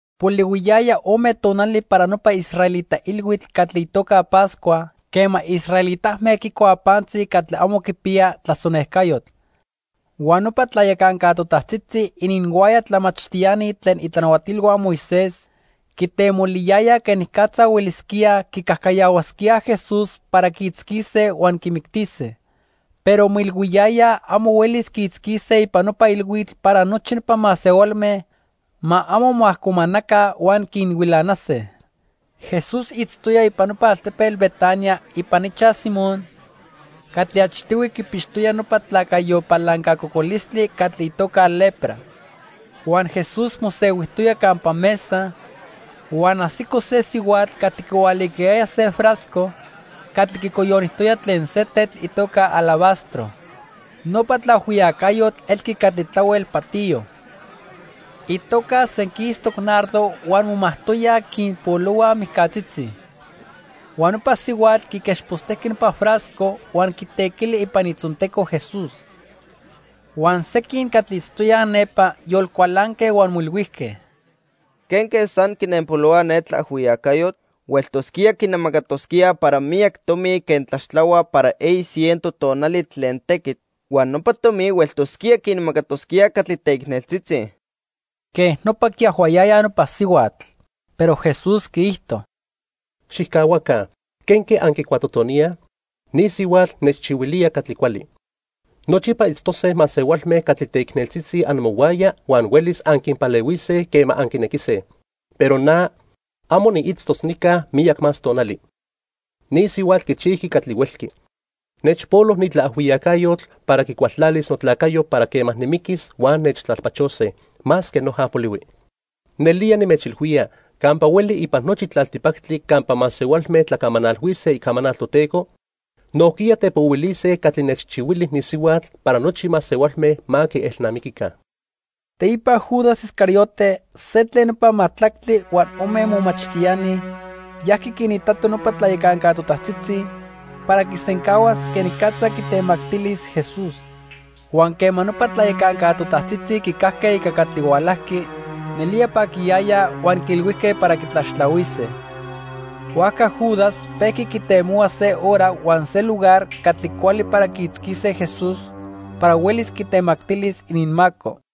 Polihuiyaya ome tonali para nopa israelita ilhuitl catli itoca Pascua quema israelitame quicuaj pantzi catli amo quipiya tlasonejcayotl. Huan nopa tlayacanca totajtzitzi ininhuaya tlamachtiani tlen itlanahuatilhua Moisés quitemoliyayaj quenicatza huelisquíaj quicajcayahuasquíaj Jesús para quiitzquise huan quimictise. Pero moilhuiyayaj amo huelis quiitzquise ipan nopa ilhuitl para nochi nopa masehualme ma amo moajcomanaca huan quinhuilanase. Jesús itztoya ipan nopa altepetl Betania ipan ichaj Simón catli achtihui quipixtoya nopa tlacayo palanca cocolistli catli itoca lepra. Huan Jesús mosehuijtoya campa mesa, huan ajsico se sihuatl catli quihualicayaya se frasco catli quicoyonijtoya tlen se tetl itoca alabastro. Nopa tlaajhuiyacayotl elqui catli tlahuel patiyo. Itoca senquistoc nardo huan momajtoyaj quinpolohuaj mijcatzitzi. Huan nopa sihuatl quiquechpostejqui nopa frasco huan quitequili ipan itzonteco Jesús. Huan sequin catli itztoyaj nepa yolcualanque huan moilhuijque: —¿Quenque san quinenpolohua ne tlaajhuiyacayotl? Hueltosquía quinemacatosquía para miyac tomi quen tlaxtlahuaj para eyi ciento tonali tlen tequitl huan nopa tomi hueltosquía quinmacatosquíaj catli teicneltzitzi. Quej nopa quiajhuayayaj nopa sihuatl. Pero Jesús quiijto: —Xijcahuaca, ¿quenque anquicuatotoníaj? Ni sihuatl nechchihuilía catli cuali. Nochipa itztose masehualme catli teicneltzitzi amohuaya huan huelis anquinpalehuise quema anquinequise, pero na, amo niitztos nica miyac más tonali. Ni sihuatl quichijqui catli huelqui. Nechpolo ni tlaajhuiyacayotl para quicualtlalis notlacayo para quema nimiquis huan nechtlalpachose, masque noja polihui. Nelía nimechilhuía, campa hueli ipan nochi tlaltipactli campa masehualme tlacamanalhuise icamanal Toteco, nojquiya tepohuilise catli nechchihuili ni sihuatl para nochi masehualme ma quielnamiquica. Teipa Judas Iscariote, se tlen nopa majtlactli huan ome momachtiani, yajqui quinitato nopa tlayacanca totajtzitzi para quisencahuas quenicatza quitemactilis Jesús. Huan quema nopa tlayacanca totajtzitzi quicajque ica catli hualajqui, nelía paquiyayaj huan quiilhuijque para quitlaxtlahuise. Huajca Judas pejqui quitemohua se hora huan se lugar catli cuali para quiitzquise Jesús para huelis quitemactilis ininmaco.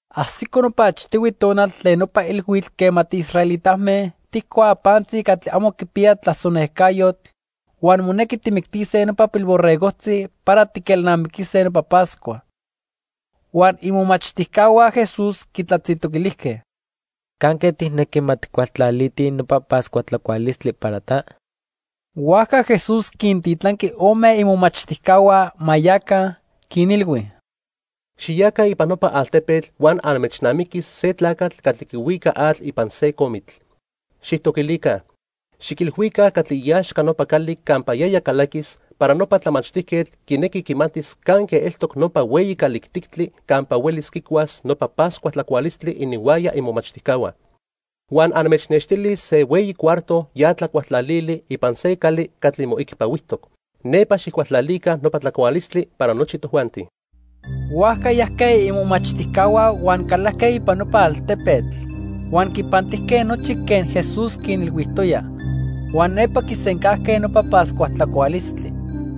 Ajsico nopa achtihui tonal tlen nopa ilhuitl quema tiisraelitame tijcuaj pantzi catli amo quipiya tlasonejcayotl huan monequi tijmictise nopa pilborregojtzi para tiquelnamiquise nopa Pascua. Huan imomachtijcahua Jesús quitlatzintoquilijque: —¿Canque tijnequi ma tijcualtlalitij nopa Pascua tlacualistli para ta? Huajca Jesús quintitlanqui ome imomachtijcahua ma yaca, quinilhui: —Xiyaca ipan nopa altepetl huan anmechnamiquis se tlacatl catli quihuica atl ipan se comitl. Xijtoquilica. Xiquilhuica catli iaxca nopa cali campa yaya calaquis para nopa tlamachtijquetl quinequi quimatis canque eltoc nopa hueyi calijtictli campa huelis quicuas nopa Pascua tlacualistli ininhuaya imomachtijcahua. Huan anmechnextilis se hueyi cuarto ya tlacualtlalili ipan se cali catli moicpahuijtoc. Nepa xijcualtlalica nopa tlacualistli para nochi tojuanti. Huajca yajque imomachtijcahua huan calajque ipan nopa altepetl. Huan quipantijque nochi quen Jesús quinilhuijtoya. Huan nepa quisencajque nopa Pascua tlacualistli.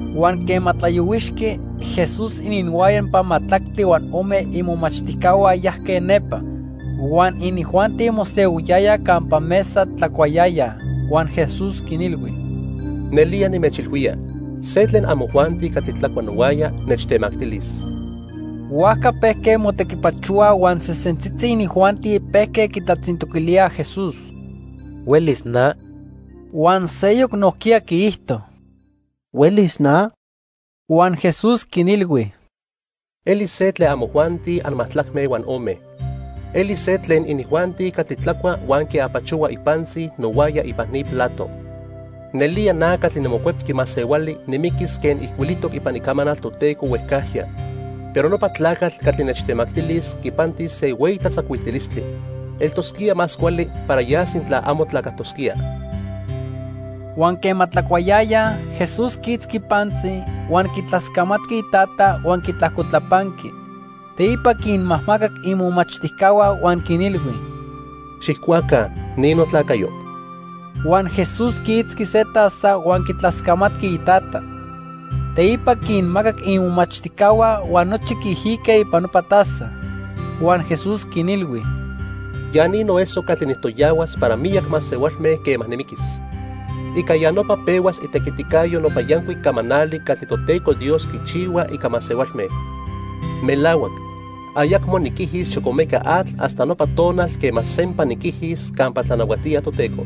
Huan quema tlayohuixqui, Jesús ininhuaya nopa majtlactli huan ome imomachtijcahua yajque nepa. Huan inijuanti mosehuiyayaj campa mesa tlacuayayaj, huan Jesús quinilhui: —Nelía nimechilhuía, se tlen amojuanti catli tlacua nohuaya, nechtemactilis. Huajca pejque motequipachohuaj huan sesentzitzi inijuanti pejque quitlatzintoquilíaj Jesús: —¿Huelis na? Huan seyoc nojquiya quiijto: —¿Huelis na? Huan Jesús quinilhui: —Elis se tlen amojuanti anmajtlacme huan ome. Elis se tlen inijuanti catli tlacua huan quiapachohua ipantzi nohuaya ipan ni plato. Nelía na catli niMocuepqui Masehuali nimiquis quen ijcuilijtoc ipan Icamanal Toteco huejcajya, pero nopa tlacatl catli nechtemactilis quipantis se hueyi tlatzacuiltilistli. Eltosquía más cuali para ya sintla amo tlacajtosquía. Huan quema tlacuayayaj, Jesús quiitzqui pantzi, huan quitlascamatqui iTata huan quitlajcotlapanqui. Teipa quinmajmacac imomachtijcahua huan quinilhui: —Xijcuaca, ni notlacayo. Huan Jesús quiitzqui se taza huan quitlascamatqui iTata. Teipa quinmacac imomachtijcahua huan nochi quiijique ipan nopa taza. Huan Jesús quinilhui: —Ya ni noeso catli nijtoyahuas para miyac masehualme quema nimiquis. Ica ya nopa pehuas itequiticayo nopa yancuic camanali catli Toteco Dios quichihua ica masehualme. Melahuac, ayacmo niquijis xocomeca atl hasta nopa tonal quema sempa niquijis campa tlanahuatía Toteco.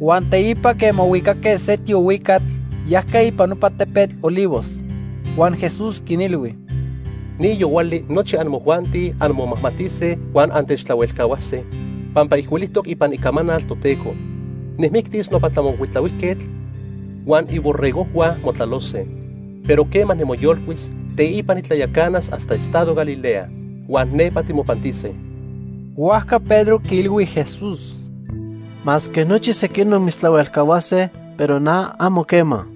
Huan teipa quema huicaque se tiohuicatl, yajque ipan nopa tepetl Olivos. Huan Jesús quinilhui: —Ni yohuali nochi amojuanti anmomajmatise huan antechtlahuelcahuase, pampa ijcuilijtoc ipan Icamanal Toteco: 'Nijmictis nopa tlamocuitlahuijquetl, huan iborregojhua motlalose.' Pero quema nimoyolcuis, teipa nitlayacanas hasta estado Galilea. Huan nepa timopantise. Huajca Pedro quiilhui Jesús: —Masque nochi sequinoc mitztlahuelcahuase, pero na, amo quema.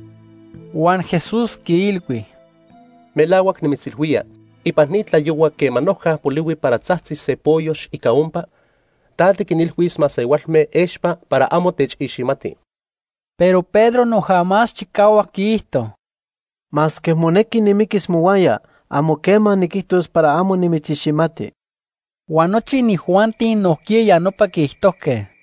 Huan Jesús quiilhui: —Melahuac nimitzilhuía, ipan ni tlayohua quema noja polihui para tzajtzis se poyox ica ompa, ta tiquinilhuis masehualme expa para amo techiximati. Pero Pedro noja más chicahuac quiijto: —Masque monequi nimiquis mohuaya, amo quema niquijtos para amo nimitziximati. Huan nochi inijuanti nojquiya ya nopa quiijtojque.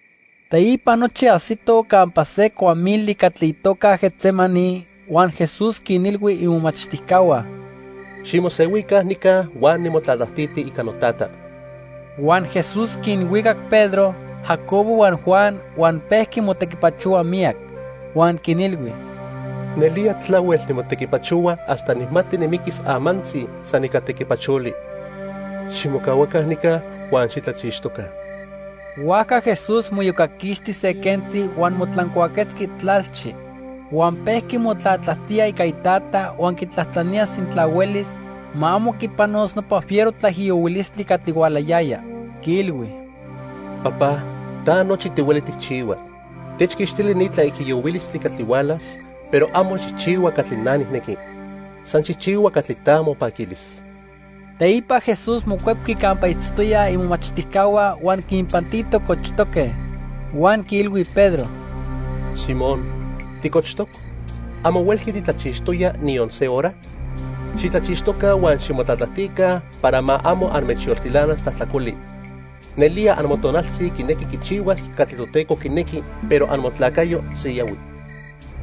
Teipa nochi ajsitoj campa se cuamili catli itoca Getsemaní huan Jesús quinilhui imomachtijcahua: —Ximosehuica nica huan nimotlatlajtiti ica noTata. Huan Jesús quinhuicac Pedro, Jacobo huan Juan huan pejqui motequipachohua miyac. Huan quinilhui: —Nelía tlahuel nimotequipachohua hasta nijmati nimiquis amantzi san ica tequipacholi. Ximocahuaca nica huan xitlachixtoca. Huajca Jesús moiyocaquixti se quentzi huan motlancuaquetzqui tlalchi. Huan pejqui motlatlajtía ica Itata huan quitlajtlanía sintla huelis, ma amo quipanos nopa fiero tlaijiyohuilistli catli hualayaya. Quiilhui: "Papá, ta nochi tihueli tijchihua. Techquixtili ni tlaijiyohuilistli catli hualas, pero amo xijchihua catli na nijnequi, san xijchihua catli ta mopaquilis." Teipa Jesús mocuepqui campa itztoyaj imomachtijcahua huan quinpantito cochtoque; huan quiilhui Pedro: —Simón, ¿ticochtoc? ¿Amo huelqui titlachixtoya niyon se hora? Xitlachixtoca huan ximotlatlajtica para ma amo anmechyoltilanas tlajtlacoli. Nelía amotonaltzi quinequi quichihuas catli Toteco quinequi, pero amotlacayo siyahui.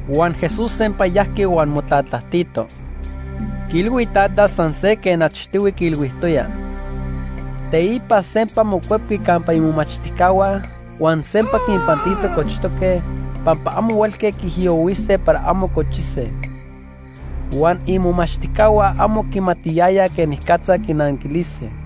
Huan Jesús sempa yajqui huan motlatlajtito. Quiilhui Itata san se quen achtihui quiilhuijtoya. Teipa sempa mocuepqui campa imomachtijcahua huan sempa quinpantito cochtoque, pampa amo huelque quiijiyohuise para amo cochise. Huan imomachtijcahua amo quimatiyayaj quenicatza quinanquilise.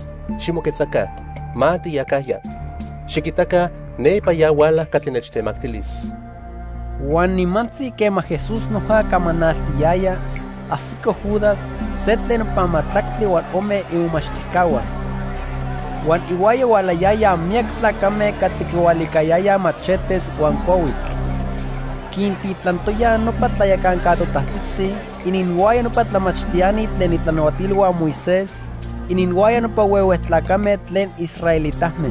Ximoquetzaca, ma tiyacajya. Xiquitaca, nepa ya huala catli nechtemactilis. Huan nimantzi quema Jesús noja camanaltiyaya, ajsico Judas, se tlen nopa majtlactli huan ome imomachtijcahua. Huan ihuaya hualayayaj miyac tlacame catli quihualicayayaj machetes huan cuahuitl. Quintitlantoyaj nopa tlayacanca totajtzitzi, ininhuaya nopa tlamachtiani tlen itlanahuatilhua Moisés, ininhuaya nopa huehue tlacame tlen israelitame.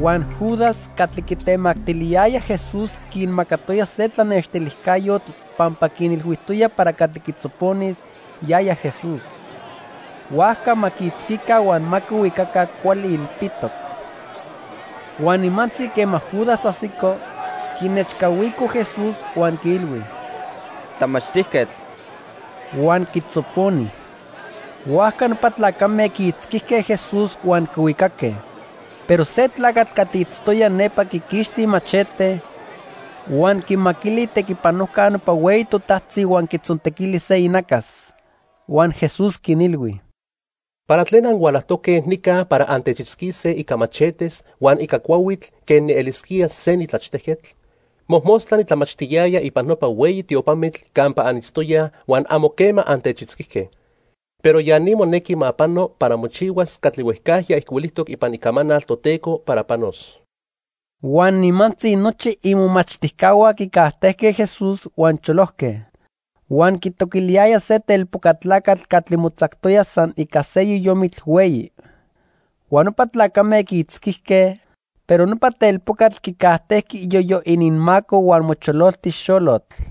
Huan Judas catli quitemactiliyaya Jesús quinmacatoya se tlanextilijcayotl pampa quinilhuijtoya para catli quitzoponis, yaya Jesús. Huajca ma quiitzquica huan ma quihuicaca cuali ilpitoc. Huan nimantzi quema Judas ajsico, quinechcahuico Jesús huan quiilhui: —¡Tlamachtijquetl! Huan quitzoponi. Huajca nopa tlacame quiitzquijque Jesús huan quihuicaque. Pero se tlacatl catli itztoya nepa quiquixti imachete, huan quimaquili itequipanojca nopa hueyi totajtzi huan quitzontequili se inacas. Huan Jesús quinilhui: —¿Para tlen anhualajtoque nica para antechitzquise ica machetes huan ica cuahuitl quen nielisquía se nitlachtejquetl? Mojmostla nitlamachtiyaya ipan nopa hueyi tiopamitl campa anitztoyaj huan amo quema antechitzquijque. Pero ya ni monequi ma pano para mochihuas catli huejcajya ijcuilijtoc ipan Icamanal Toteco para panos. Huan nimantzi nochi imomachtijcahua quicajtejque Jesús huan cholojque. Huan quitoquiliyaya se telpoca tlacatl catli motzactoya san ica se yoyomitl hueyi. Huan nopa tlacame quiitzquijque, pero nopa telpocatl quicajtejqui iyoyo ininmaco huan mochololti xolotl.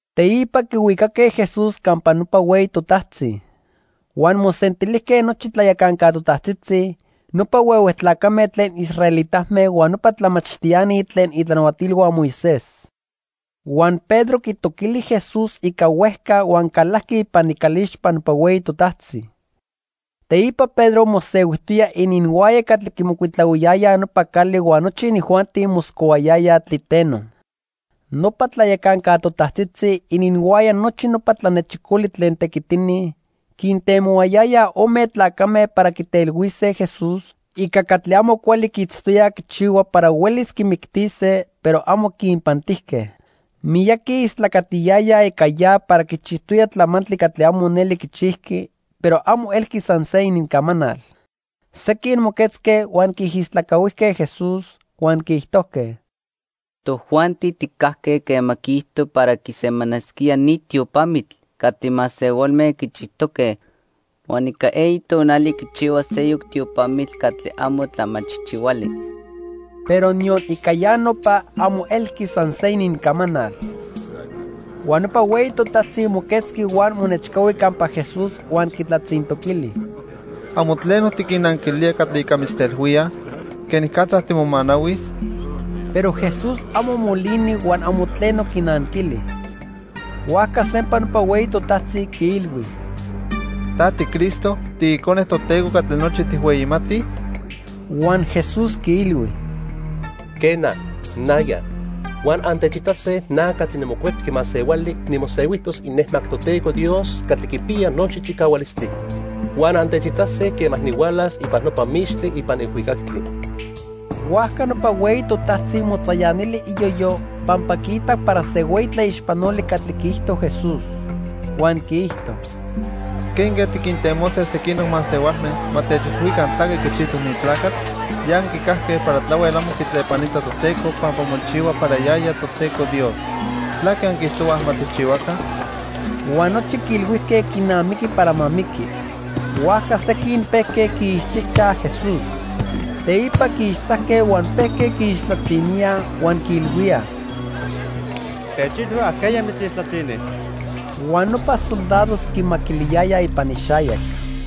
Teipa quihuicaque Jesús campa nopa hueyi totajtzi. Huan mosentilijque nochi tlayacanca totajtzitzi, nopa huehue tlacame tlen israelitame huan nopa tlamachtiani tlen itlanahuatilhua Moisés. Huan Pedro quitoquili Jesús ica huejca huan calajqui ipan icalixpa nopa hueyi totajtzi. Teipa Pedro mosehuijtoya ininhuaya catli quimocuitlahuiyayaj nopa cali huan nochi inijuanti moscohuayayaj tliteno. Nopa tlayacanca totajtzitzi ininhuaya nochi nopa tlanechicoli tlen tequitini quintemohuayayaj ome tlacame para quitelhuise Jesús ica catli amo cuali quiitztoyaj quichihua para huelis quimictise, pero amo quinpantijque. Miyaqui istlacatiyayaj ica ya para quichijtoya tlamantli catli amo neli quichijqui pero amo elqui san se inincamanal. Sequin moquetzque huan quiijistlacahuijque Jesús, huan quiijtojque: —Tojuanti tijcajque quema quiijto para quisemanasquía ni tiopamitl catli masehualme quichijtoque huan ica eyi tonali quichihuas seyoc tiopamitl catli amo tlamachijchihuali. Pero niyon ica ya nopa, amo elqui san se inincamanal. Huan nopa hueyi totajtzi moquetzqui huan monechcahui campa Jesús huan quitlatzintoquili: —¿Amo tleno tiquinnanquilía catli ica mitztlatelhuíaj? ¿Quenicatza timomanahuis? Pero Jesús amo molini huan amo tleno quinanquili. Huajca sempa nopa hueyi totajtzi quiilhui: —¿Ta tiCristo, tiIcone Toteco catli nochi tijhueyimatij? Huan Jesús quiilhui: —Quena, naya. Huan antechitase na catli niMocuepqui Masehuali nimosehuijtos inejmac Toteco Dios catli quipiya nochi chicahualistli. Huan antechitase quema nihualas ipan nopa mixtli ipan ilhuicactli. Huajca nopa hueyi totajtzi motzayanili iyoyo pampa quiitac para se hueyi tlaixpanoli catli quiijto Jesús. Huan quiijto: —¿Quenque tiquintemose sequinoc masehualme ma techilhuica tlaque quichijtoc ni tlacatl? Ya anquicajque para tlahuel amo quitlepanita Toteco pampa mochihua para yaya Toteco Dios. ¿Tlaque anquiijtohuaj ma tijchihuaca? Huan nochi quiilhuijque quinamiqui para ma miqui. Huajca sequin pejque quiixchijchaj Jesús. Teipa quiixtzajque huan pejque quiixtlatziníaj huan quiilhuíaj: —¡Techilhui ajqueya mitzixtlatzini! Huan nopa soldados quimaquiliyayaj ipan ixayac.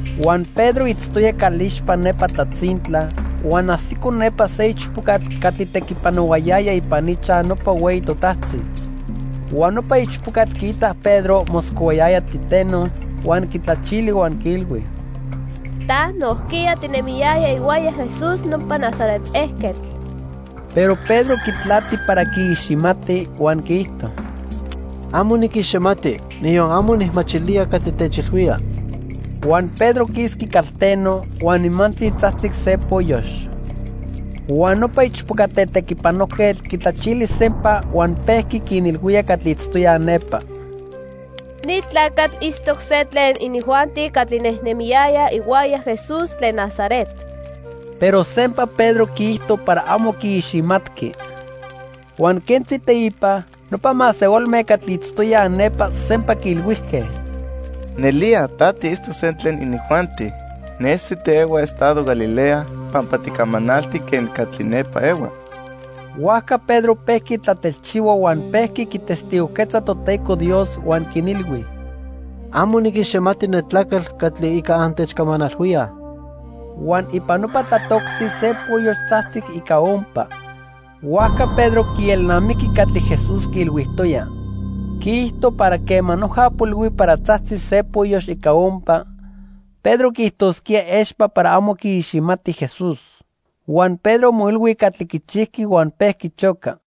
Huan Pedro itztoya calixpa nepa tlatzintla, huan ajsico nepa se ichpocatl catli tequipanohuayaya ipan ichaj nopa hueyi totajtzi. Huan nopa ichpocatl quiitac Pedro moscohuayaya tliteno, huan quitlachili huan quiilhui: —Ta nojquiya tinemiyaya ihuaya Jesús nopa Nazaret ejquetl. Pero Pedro quitlati para quiiximati, huan quiijto: —Amo niquiximati, niyon amo nijmachilía catli techilhuía. Huan Pedro quisqui calteno, huan nimantzi tzajtzic se poyox. Huan nopa ichpoca tetequipanojquetl quitlachili sempa huan pejqui quinilhuía catli itztoyaj nepa: —Ni tlacatl itztoc se tlen inijuanti catli nejnemiyayaj ihuaya Jesús tlen Nazaret. Pero sempa Pedro quiijto para amo quiiximatqui. Huan quentzi teipa, nopa masehualme catli itztoyaj nepa sempa quiilhuijque: —Nelía ta tiitztoc se tlen inijuanti. Nesi tiehua estado Galilea pampa ticamanalti quen catli nepa ehuaj. Huajca Pedro pejqui tlatelchihua huan pejqui quitestigojquetza Toteco Dios huan quinilhui: —Amo niquiximati ne tlacatl catli ica antechcamanalhuíaj. Huan ipan nopa tlatoctzi se poyox tzajtzic ica ompa. Huajca Pedro quielnamijqui catli Jesús quiilhuijtoya. Quiijto para quema noja polihui para tzajtzis se poyox ica ompa, Pedro quiijtosquía expa para amo quiiximati Jesús. Huan Pedro moilhui catli quichijqui huan pejqui choca.